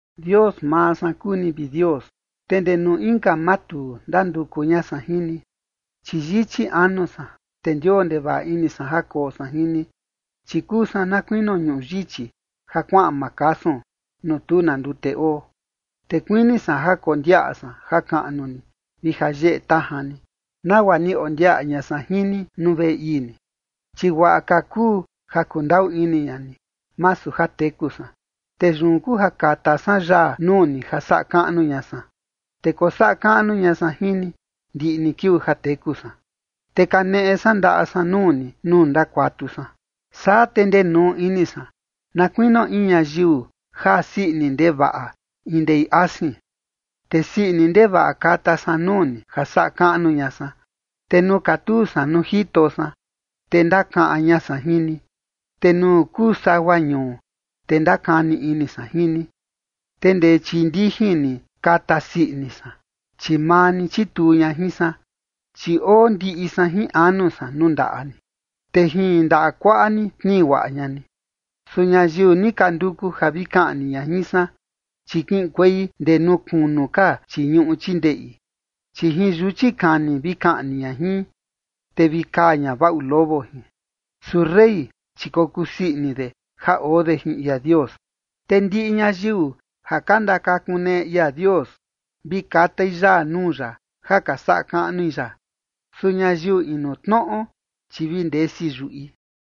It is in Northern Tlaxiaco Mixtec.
Dios maa san kuu ni, vi Dios, te ndee nuu inka matuu ndanduku ña san jin ni, chi yichi anu san, te ndioo ndevaꞌa ini san ja koo san jin ni, chi kuu san na kuinio ñuꞌu yichi ja kuaꞌan makasun, nuu tu na ndute oo. Te kuini san ja kondiaꞌa san jakaꞌnu ni vi jayeꞌe tajan ni, nagua ni ondiaꞌa ña san jin ni nuu veꞌe ii ni. Chi guaꞌa ka kuu ja kundaꞌu ini ña ni, masu ja teku san, te yun kuu ja kata san yaa nuu ni ja saꞌa kaꞌnu ña san. Te kosaꞌa kaꞌnu ña san jin ni ndiꞌi ni kiuu ja teku san, te kaneꞌe san ndaꞌa san nuu ni nuu ndakuatu san. Saa te ndenuu ini san, na kuinio in ñayiu jaa sii ini ndevaꞌa in ndei asin, te sii ini ndevaꞌa kata san nuu ni ja saꞌa kaꞌnu ña san. Te nuu katuu san nuu jito san, te ndakaꞌan ña san jin ni, te nuu kuu sagua ñuu, te ndakani ini san jin ni. Te ndee chii ndijin ni kata sii ini san, chi maa ni chituu ña jin san. Chi oo ndiꞌi san jin anu san nuu ndaꞌa ni, te jin ndaꞌa kuaꞌa ni tnii guaꞌa ña ni. Su ñayiu ni ka nduku ja vi kaꞌni ña jin san, chi kiꞌinkuei ndee nuu kunu ka chii ñuꞌu chii ndeꞌi. Chi jin yuchi kani vi kaꞌni ña jin, te vi kaa ña vaꞌu lobo jin. Su rey, chi kokusii ini de ja oo de jin ia Dios, te ndiꞌi ñayiu ja ka ndakakuneꞌe ia Dios vi katai yaa nuu ya ja ka saꞌa kaꞌnui ya. Su ñayiu inu tnoꞌo, chi vi ndesi yuꞌi.